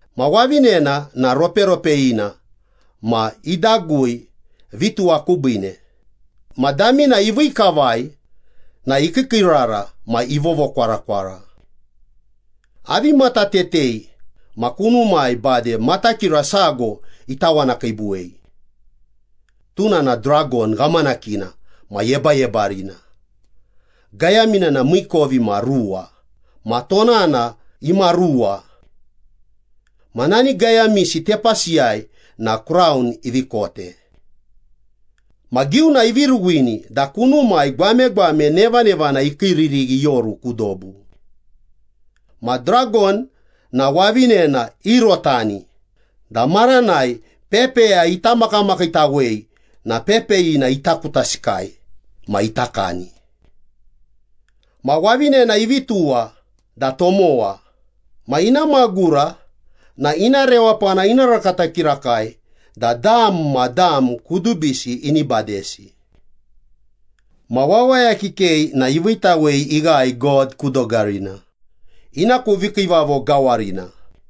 Ma wavinena na roperopeyina ma idagui vituwa kubiine, ma damina ivii kavai na ikiikiirara ma ivovokwarakwara. Avivi matatete ma kunumai bade matakira sago itawanakiibuwei. Tuna na dragon ghamanakina ma yebayebarina, gayamina na miikovimaruwa ma tonana imaruwa. Ma nani gayamisi tepasiyai na kraun ivi kote. Ma giuna ivi ruwini da kunumai gwamegwame nevanevana ikiiririghi ioru ku dobu. Ma dragon na wavinena iurotani da maranai pepeya ita makamakiitawei na pepeyina ita kutasikai ma ita kani. Ma wavinena ivi tuwa da tomowa ma ina magura na ina rewapana ina rakata kirakai da dam ma dam kudubisi ini badesi. Ma wawaya kikei na iviitawei ighae God ku dogarina, ina ku vikiivavo gawarina.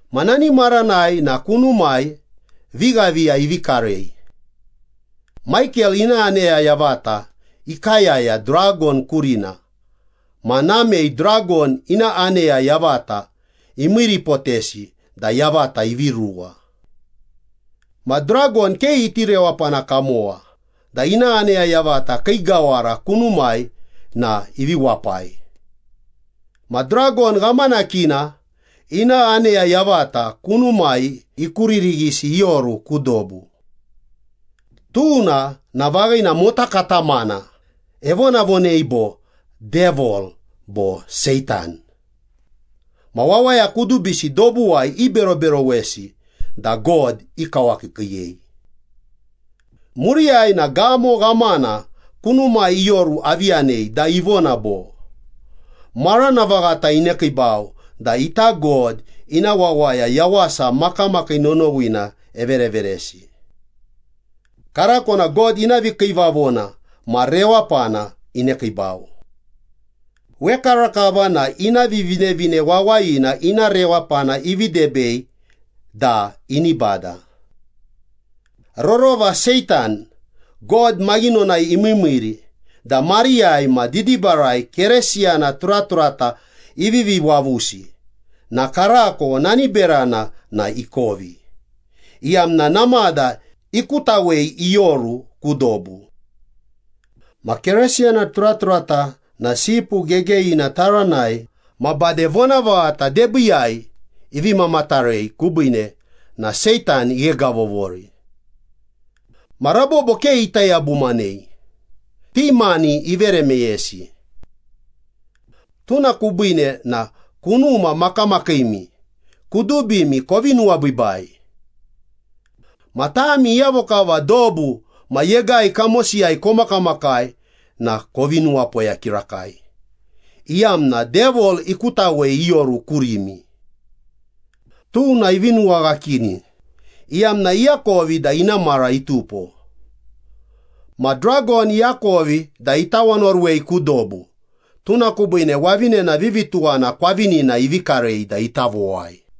Ma nani maranai na kunumai vighaviya ivi karei. Maikel ina aneya yavata ikayaya dragon kurina ma namei dragon ina aneya yavata imiiripotesi da yavata ivi ruwa. Ma dragon ke iti rewapana kamowa da ina aneya yavata kii gawara kunumai na ivi wapai. Ma dragon ghamanakina ina aneya yavata kunumai ikuririghisi ioru ku dobu. Tuna na vaghina mota katamana evonavonei bo Devil bo Seitan ma wawaya kudubisi dobuwai iberoberowesi da God ikawakiikiiyei. Muriyai na gamo ghamana kunumai ioru avi yanei da ivona bo, “Marana vaghata inekiibau da ita God ina wawaya yawasa makamakii nonowina evereveresi. Karako na God ina vikiivavona ma rewapana inekiibau. Wekarakava na ina Vivinevine Wawayina ina rewapana ivi debei da ini bada. Rorova Seitan, God maghinonai imiimiiri da mariyai ma didibarai Keresiyana turaturata ivivi wavusi na karako nani berana na ikovi, iyamna namada ikutawei ioru ku dobu. Ma Keresiyana turaturata na Sipu Gegeyina taranai ma bade vonavaghata debiiyai ivi mamatarei kubiine na Seitan ighegavovori. Ma rabobo ke ita yabumanei, ti mani ivere meyesi. Tuna kubiine na kunuma makamakiimi kudubimi kovi nuwabiibai. Ma tami iyavo kava dobu ma yegai kamosiyai komakamakai na kovi nuwapoya kirakai, iyamna Devil ikutawei ioru kurimi. Tuna ivi nuwaghakini, iyamna iakovi da ina mara itupo.” Ma dragon iakovi da itawanoruwei ku dobu, tuna kubiine wavinena vivituwana kwavinina ivi karei da ita vowai.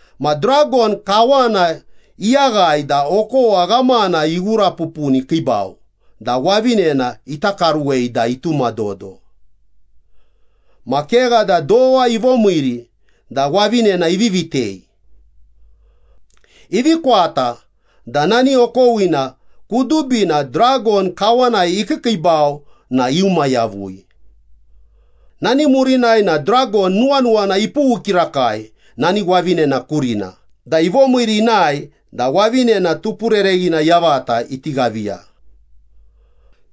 Ma dragon kawana iyaghae da okowa ghamana ighurapupuni ikiibau da wavinena ita karuwei da itumadodo. Ma kegha da dowa ivomiiri da wavinena ivi vitei. Ivi kwata da nani okowina kudubina dragon kawanai ikiikiibau na iuma yavui. Nani murinai na dragon nuwanuwana ipughu kirakai nani wavinena kurina da ivomiiri inae da wavinena tupurereghina yavata iti ghaviya.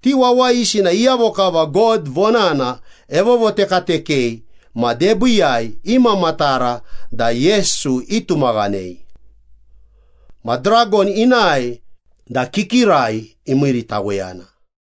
Ti wawayisi na iyavo kava God vonana evovotekatekei ma debiiyai imamatara da Yesu itumaghanei. Ma dragon inae da kikirai imiiritaweyana.